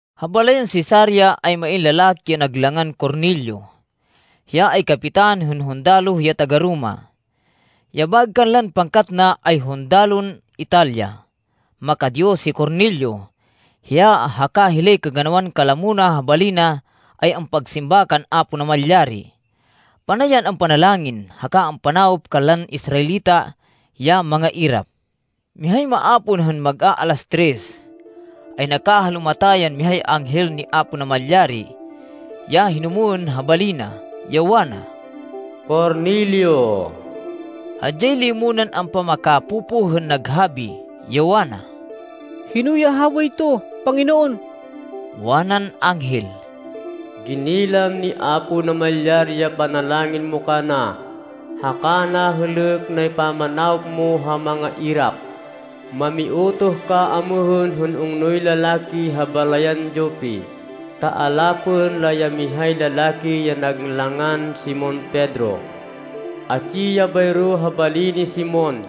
Ha balayan Cesarea ay main lalaki ya nag langan Cornelio. Hiya ay kapitan hên hundaloh ya taga-Roma. Ya baêg kanlan pangkat na, ay hundalon Italia. Maka-Diyos hi Cornelio. Hiya haka hilay kaganawan kalamo na ha bali na ay ampagsimba kan Apo Namalyari. Panay yan ampanalangin, haka ampanawop kanlan Israelita ya mangairap. Mihay maapon hên mag-aalas tres, ay nakahalumata yan mihay anghel ni Apo Namalyari ya hinumwên ha bali na, ya wana, “Cornelio!” Hadyay limo nan ampamakapopoh hên naghabi, ya wana, “Hino ya habayto, Panginoon?” Wanan anghel, “Ginilam ni Apo Namalyari ya panalangin mo kana, haka nahêlêk nay pamanawop mo ha mangairap. Mamiutoh ka amêhên hên ungnoy lalaki ha balayan Jope, ta alapên la ya mihay lalaki ya nag langan Simon Pedro. Atsi ya bayro ha bali ni Simon,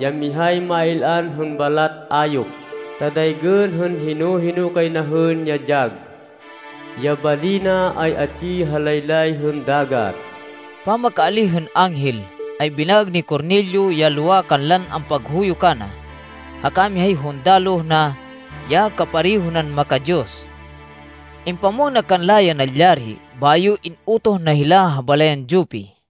ya mihay máy-il-an hên balat ayop, ta daygên hên hino-hino kay na hên ya dyag. Ya bali na ay atsi ha laylay hên dagat.” Pamakaalíh hên anghel, ay binaêg ni Cornelio ya lowa kanlan ampaghuyo kana, haka mihay hundaloh na ya kapareho nan maka-Diyos. Impamwang na kanla ya nalyari, bayo in-utoh na hila ha balayan Jope.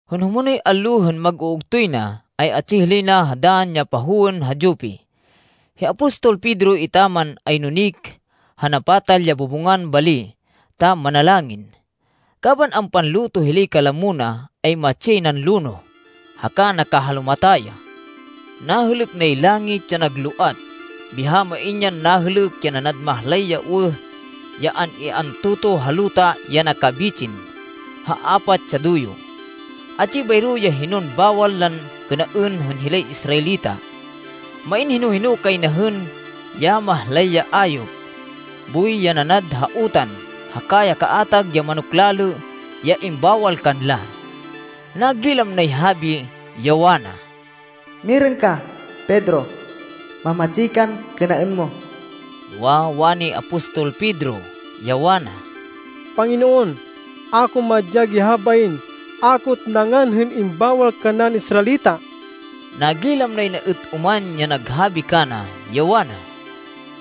Hên humonoy allo, hên mag-uugtoy na, ay atsi hilay na ha dann ya pahowên ha Jope. Hi apostol Pedro etaman, ay nunik ha napatal ya bubungan bali ta manalangin. Kaban ampanluto hilay kalamo na, ay matsi yay nan lonoh, haka nakahalumata ya. Nahêlêk nay langit ya nagloat, biha main yan nahêlêk ya nanad mahlay ya uwêh ya an-i-antotoh ha luta ya nakabitsin ha apat ya duyo. Atsi bayro ya hinon bawal lan kênaên hên hilay Israelita. Main hino-hino kay na hên ya mahlay ya ayop, boy ya nanad ha utan, haka ya kaatag ya manok lalê ya imbawal kanla. Nagilam nay habi ya wana, “Mirêng ka, Pedro. Mamatsi kan kênaên mo!” Noa, wani apostol Pedro, ya wana, “Panginoon, a ko madyag ya habain. A ko êt nangan hên imbawal kannaên Israelita.” Nagilam nay na êt oman ya naghabi kana, ya wana,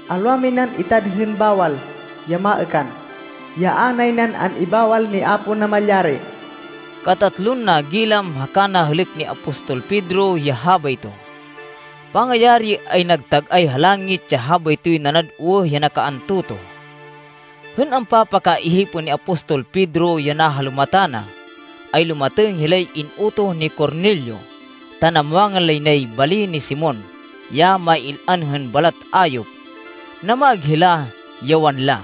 “Alwa minan itad hên bawal, ya maêkan, ya a nay nan an-ibawal ni Apo Namalyari.” Katatlon nagilam haka nahêlêk ni apostol Pedro ya habayto. Pangayari, ay nagtag-ay ha langit ya habaytoy nanad uwêh ya nakaantotoh. Hên ampapakaihipên ni apostol Pedro ya nahalumata na, ay lumatêng hilay in-utoh ni Cornelio ta namwangan lay nay bali ni Simon, ya máy-il-an hên balat ayop. Namaêg hila, ya wanla,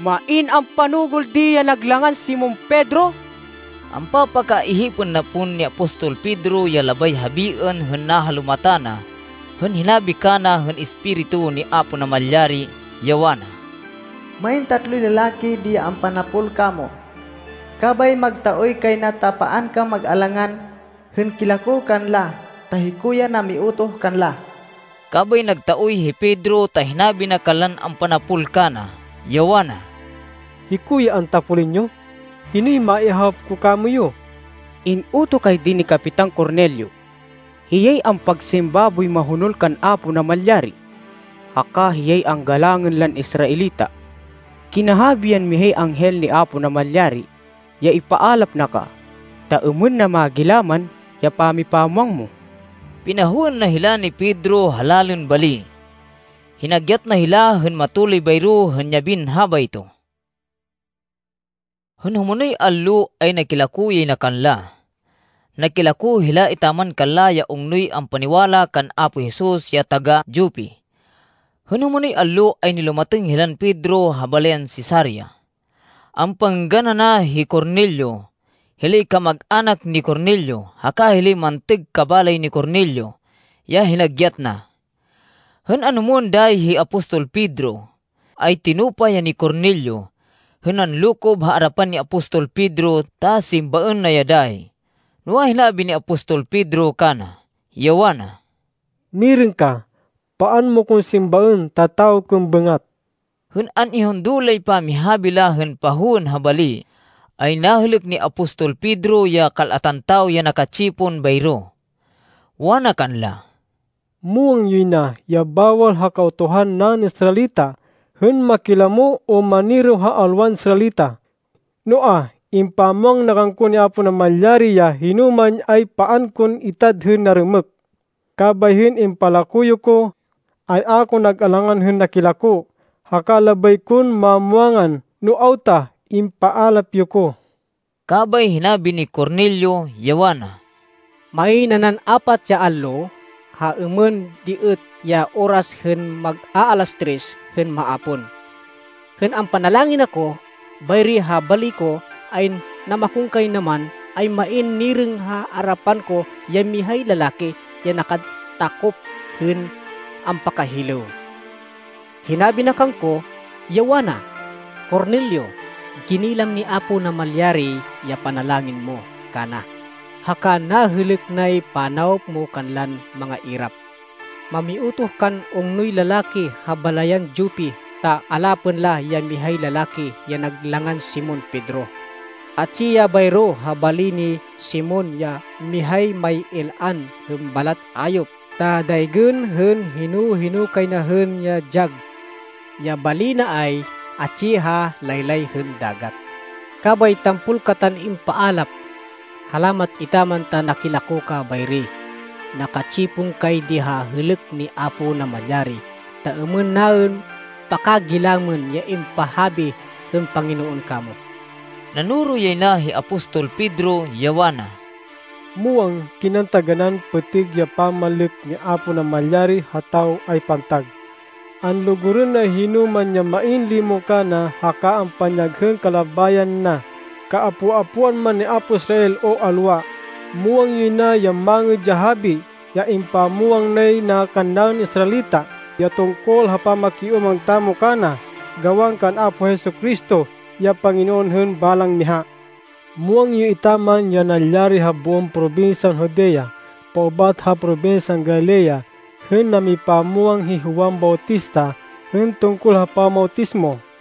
“Main ampanugêl di ya nag langan Simon Pedro?” Ampapakaihipên na pon ni apostol Pedro ya labay habiên hên nahalumata na hên hinabi kana hên Espiritu ni Apo Namalyari, ya wana, “Main tatloy lalaki di ya ampanapol kamo. Kabay magtaoy kay na ta paan kan mag-alangan hên kilako kanla ta hiko ya namiutoh kanla.” Kabay nagtaoy hi Pedro ta hinabi na kanlan ampanapol kana, ya wana, “Hiko ya antapolên yo. Hinoy maihawop ko kamoyu?” “In-utoh kay di ni Kapitan Cornelio. Hiyay ampagsimba boy mahonol kan Apo Namalyari, haka hiyay anggalangên lan Israelita. Kinahabi yan mihay anghel ni Apo Namalyari ya ipaalap na ka, ta êmên na magilaman ya pamipamwang mo.” Pinahowên na hila ni Pedro ha lalên bali. Hinagyat na hila hên matuloy bayro hên yabin habayto. Hên humonoy allo, ay nakilako yay na kanla. Nakilako hila etaman kanla ya ungnoy ampaniwala kan Apo Jesus ya taga-Jope. Hên humonoy allo, ay nilumatêng hilan Pedro ha balayan Cesarea. Ampangênggan ana hi Cornelio, hilay kamag-anak ni Cornelio, haka hilay mantêg kabalay ni Cornelio, ya hinagyat na. Hên anhumwên dayi hi apostol Pedro ay tinupa ya ni Cornelio, hên nanlokob ha arapan ni apostol Pedro ta simbaên na ya dayi. Noa, hinabi ni apostol Pedro kana, ya wana, “Mirêng ka. Paan mo kon simbaên ta tawo kon bêngat.” Hên an-ihundo lay pamihabi la hên pahowên ha bali, ay nahêlêk ni apostol Pedro ya kal-atan tawo ya naka-tsipon bayro. Wana kanla, “Muwang yoy na ya bawal ha Kautuhan naên Israelita hên makilamo o maniraw ha alwan Israelita. Noa, impamwang na kangko ni Apo Namalyari ya hinoman ay paan kon itad hên narêmêk. Kabay hên impalako yo ko, ay a ko nag-alangan hên nakilako. Haka labay kon mamwangan no awta impaalap yo ko.” Kabay hinabi ni Cornelio, ya wana, “Main nanan apat ya allo, ha êmên di êt ya oras hên mag-aalas tres hên maapon, hên ampanalangin ako bayri ha bali ko, ay namakonkaynaman, ay main nirêng ha arapan ko ya mihay lalaki ya nakatakop hên ampakahilêw. Hinabi na kangko, ya wana, ‘Cornelio! Ginilam ni Apo Namalyari ya panalangin mo kana, haka nahêlêk nay panawop mo kanlan mangairap. Mamiutoh kan ungnoy lalaki ha balayan Jope ta alapên la ya mihay lalaki ya nag langan Simon Pedro. Atsi ya bayro ha bali ni Simon, ya mihay máy-il-an hên balat ayop ta daygên hên hino-hino kay na hên ya dyag. Ya bali na ay atsi ha laylay hên dagat.’ Kabay tampol katan impaalap. Halamat etaman ta nakilako ka bayri. Naka-tsipon kay di ha hêlêk ni Apo Namalyari, ta êmên naên pakagilamên ya impahabi hên Panginoon kamo.” Nanoro yay na hi apostol Pedro, ya wana, “Muwang kinan taganán pêtêg ya pamanlêk ni Apo Namalyari ha tawo ay pantag. Anlugurên nay hinoman ya main limo kana haka ampanyag hên kalabayan na, kaapo-apoan man ni apo Israel o alwa. Muwang yoy na ya Mangêd ya Habi, ya impamwang nay na kannaên Israelita ya tungkol ha pamakiúmang tamo kana gawan kan Apo Jesu-Cristo, ya Panginoon hên balang miha. Muwang yo etaman ya nalyari ha boon probinsyan Judea, paubat ha probinsyan Galilea hên namipamwang hi Juan Bautista hên tungkol ha pamawtismo.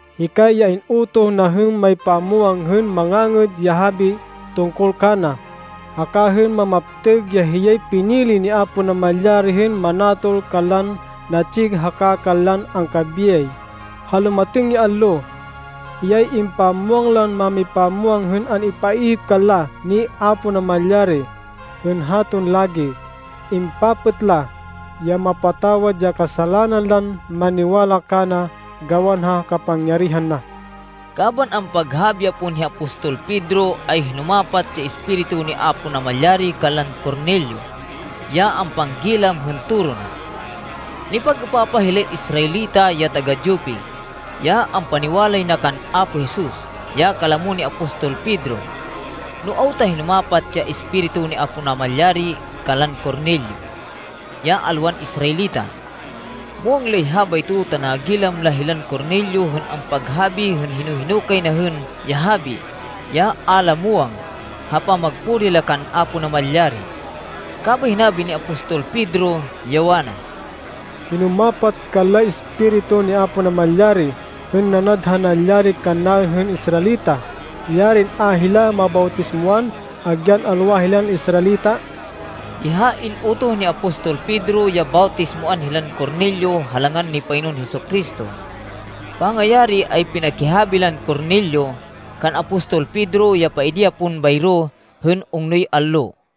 Hikay ya in-utoh na hên maypamwang hên Mangangêd ya Habi tungkol kana, haka hên mamaptêg ya hiyay pinili ni Apo Namalyari hên manatol kanlan natsi haka kanlan angkabiyay, ha lumatêng ya allo. Hiyay impamwang lan mámipamwang hên an-ipaihip kanla ni Apo Namalyari, hên haton lagi. Impapêt la, ya mapatawad ya kasalanan lan maniwala kana gawan ha kapangyarihan na.” Kaban ampaghabi ya pon hi apostol Pedro, ay hinumapat ya Espiritu ni Apo Namalyari kanlan Cornelio ya ampanggilam hên toro na. Nipag-êpapah hilay Israelita ya taga-Jope, ya ampaniwalay na kan Apo Jesus, ya kalamo ni apostol Pedro, no awta hinumapat ya Espiritu ni Apo Namalyari kanlan Cornelio, ya alwan Israelita. Muwang lay habayto, ta nagilam la hilan Cornelio hên ampaghabi hên hino-hino kay na hên ya habi, ya a la muwang, ha pamagpuri la kan Apo Namalyari. Kabay hinabi ni apostol Pedro, ya wana, “Hinumapat kanlay Espiritu ni Apo Namalyari hên nanad ha nalyari kannaên hên Israelita. Yarin a hila mabawtismoan agyan alwa hilan Israelita!” Biha in-utoh ni apostol Pedro ya bawtismoan hilan Cornelio ha langan ni Panginoon Jesu-Cristo. Pangayari ay pinakihabi lan Cornelio kan apostol Pedro ya paidi ya pon bayro hên ungnoy allo.